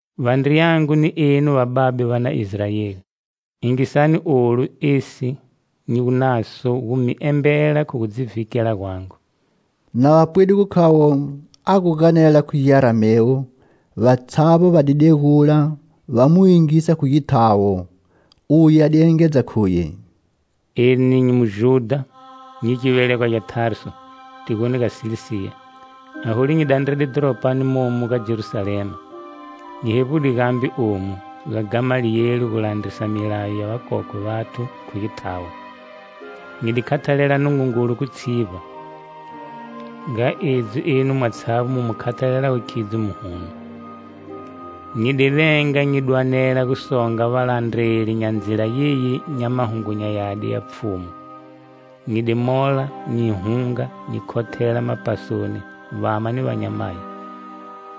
"Vandriyangu ni enu vababe va na Israeli! Yingisani olu esi nyi gu naso gu mi embela khu gu dzi vhikela gwangu." Na va pwide gu khavo a gu ganela khu Giaramewu, vatshavbo va di degula, va mu yingisa khu githawo. Uye a di engedza khuye: "Eni nyi Mujudha, nyi givelegwa gya Tarsu, tigoni ga Silisiya. Aholu nyi dandrede dhoropani momu ga Jerusalema. Nyi hevbude gambe omu, ga Gamaliyeli, gu landrisa milayo ya vakokwe vathu khu githawo. Nyi di khathalela Nungungulu khu tshivba, nga edzi enu mwatshavbo mu mu khathalelago khidzo muhuno. Nyi di venga nyi dwanela gu songa valandreli nya Ndzila yeyi nya Mahungu nya Yadi ya Pfhumu. Nyi di mola, nyi hunga, nyi khothela mapasoni vama ni vanyamayi.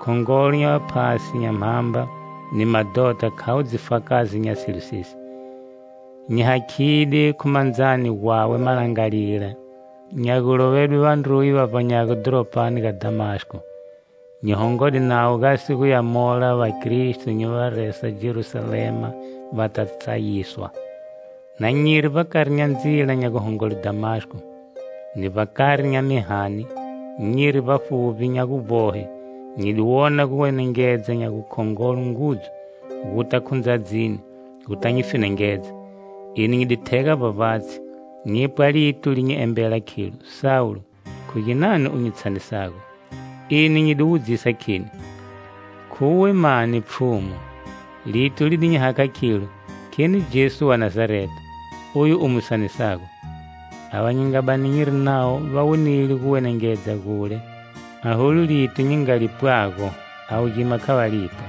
Khongolo nya vaphasi nya mhamba ni madhota khavo dzifakazi nya silo sesi. Nyi hakhide khu mandzani gwawe malangalila nya gulovedwe vandruye va vbanyago dhoropani ga Dhamasko. Nyi hongode nawo gasi guya mola vakristo nyi va resa Jerusalema va ta tsayiswa. "Na nyiri vbakari nya ndzila nya guhongole Dhamasko, ni vbakari nya mihani, nyiri vbafuvbi nya guvbohe, nyi di wona guwenengedza nya gukhongolo ngudzu, guta khu ndzadzini, guta nyi fenengedza. Eni nyi di thega vbavbatshi, nyipwa lito li nyi embela khilo: 'Sawulo! Khu ginani u nyi tshanisago?' Eni nyi di wudzisa kheni: 'Khuwe mani, Pfhumu?' Lito li di nyi hakha khilo: 'Kheni Jesu wa Nazareta, oyu u mu sanisago!' Ava nyi nga bani nyiri navo va wonide guwenengedza gule, aholu lito nyi nga lipwago, avo gima kha va lipwa.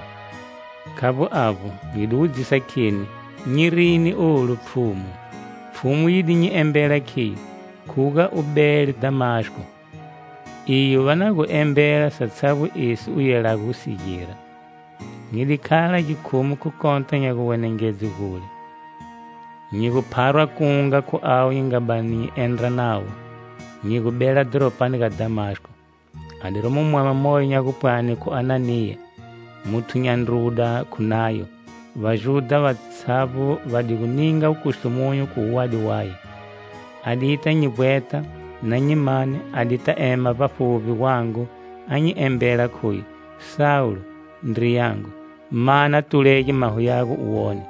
Khavbo avbo, nyi di wudzisa kheni: 'Nyi rini olu, Pfhumu?' Pfhumu yi di nyi embela khiyo: 'Khuga u bele Dhamasko, iyo va na gu embela satshavbo esi u yelago gu si gira.' Nyi di khala gikhumu khu kota nya guwenengedze gule, nyi gu pharwa kunga khu avo nyi nga bani nyi gu endra navo, nyi gu bela dhoropani ga Dhamasko. "A di romo mwama moyo nya gupwani khu Ananiya, muthu nya ndruda khu Nayo. Vajudha vatshavbo va di gu ninga wukustumunyu khu wuwadi waye. A dita nyi vbweta. Na nyi mane, a dita ema vbafuvbi gwangu a nyi embela khuye 'Sawulo, ndriyangu, ma na tulege maho yago u wone.'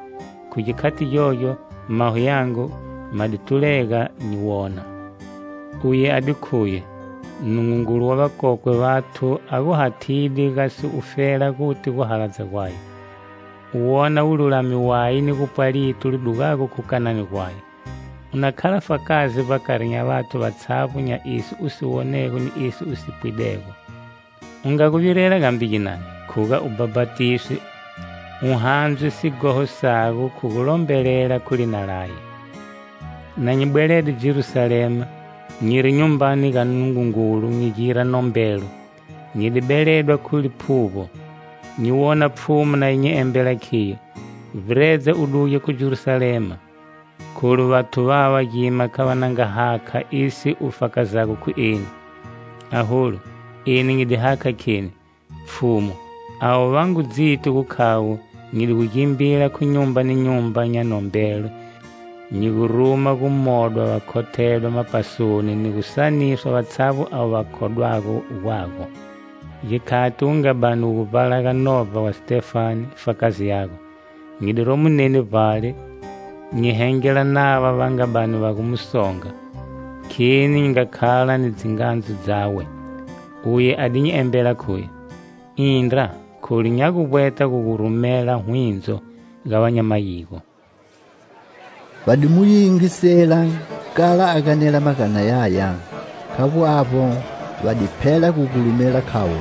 Khu gikhati gyogyo, maho yangu ma di tulega, nyi wona. Uye a di khuye: 'Nungungulu wa vakokwe vathu a gu hathide gasi ufela guti guhaladza gwaye, u wona Mululami waye ni gupwa lito li dugago khu kanani gwaye. U na khala fakazi vbakari nya vathu vatshavbo nya esi u si wonego ni esi u si pwidego. U nga gu virela gambe ginani, khuga u bhapatiswe, u handzwe sighoho sago khu gulombelela khu lina laye.' Na nyi bwelede Jerusalema, nyiri Nyumbani ga Nungungulu nyi gira nombelo, nyi di beledwa khu liphuvbo, nyi wona Pfhumu na yi nyi embela khiyo: 'Vbiredza u duge khu Jerusalema, kholu vathu vava gima kha va na nga hakha esi u fakazago khu eni.' Aholu, eni nyi di hakha kheni: 'Pfhumu, avo va ngu dziti gu khavo nyi di gu gimbila khu nyumba ni nyumba nya nombelo, nyi gu ruma gu modwa va khothedwa mapasoni ni gu tshaniswa vatshavbo avo va khodwago gwago. Gikhati wu nga bani wu gu vbalaga novba wa Sitefane, fakazi yago, nyi di romo neni vbale nyi hengela nava va nga bani va gu mu songa, kheni nyi nga khala ni dzingandzu dzawe.' Uye a di nyi embela khuye: 'Indra, kholu nya gu vbweta gu gu rumela hwindzo, ga va nya mayigo.' " Va di mu yingisela kala a ganela magana yaya. Khavbo avbo; va di phela gu gulumela, khavo: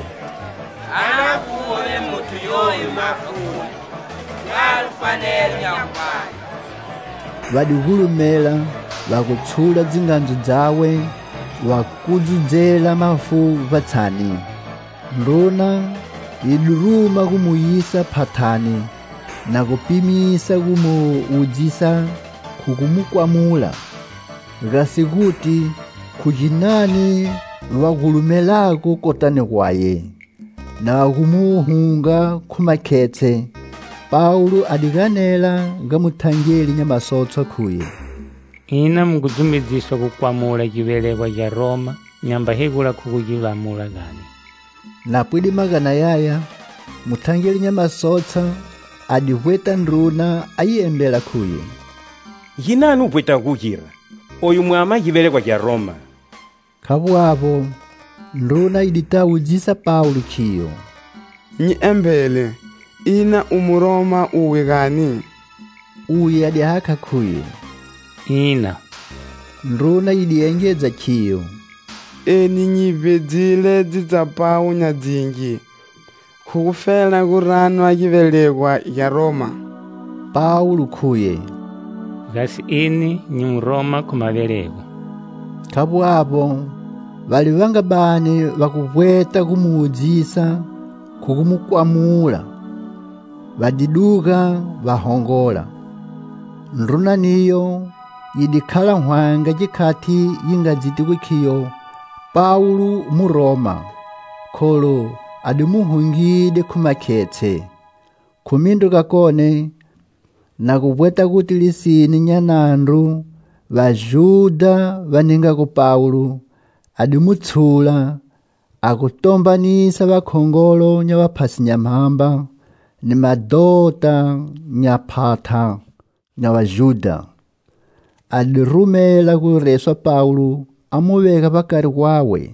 "A na fuve muthu yoyu mafuni! Mwalo fanelo nya guvbanye." Va di gulumela, va gu tshula dzingandzu dzawe, va kudzudzela mafu vbatshani. Ndruna yi di ruma gu mu yisa phathani na gu pimisa gu mu wudzisa khu gu mu kwamula, gasi guti khu ginani va gulumelago kotani gwaye. Na va gu mu hunga khu makhetshe, Pawulo a di ganela ga muthangeli nya masotshwa khuye: "Ina mu ngu dzumedziswa gu kwamula givelegwa gya Roma nyamba hegula khu gu gi lamula, gani?" Na pwide magana yaya, muthangeli nya masotshwa a di vbweta ndruna a yi embela khuye: "Ginani u vbwetago gu gira? Oyu mwama givelegwa gya Roma." Khavbo avbo, ndruna yi di ta wudzisa Pawulo khiyo: "Nyi embele, ina u mu Roma uwe gani?" Uye a di hakha khuye: "Ina." Ndruna yi di engedza khiyo: "Eni nyi vbedzile dzitsapawu nya dzingi khu gufela gu ranwa givelegwa gya Roma." Pawulo khuye: "Gasi eni nyi Muroma khu mavelego." Khavbo avbo, vale va nga bani va gu vbweta gu mu wudzisa khu gu mu kwamula, va di duga va hongola; ndruna niyo yi di khala hwanga gikhati yi nga dziti gu khiyo Pawulo Muroma, kholu a di mu hungide khu makhetshe. Khu mindru gakone, na gu vbweta guti lisine nya nandru Vajudha va ningago Pawulo, a di mu tshula, a gu tombanisa vakhongolo nya vaphasi nya mhamba, ni madhota nya phatha nya Vajudha; a di rumela gu reswa Pawulo a mu vega vbakari gwawe.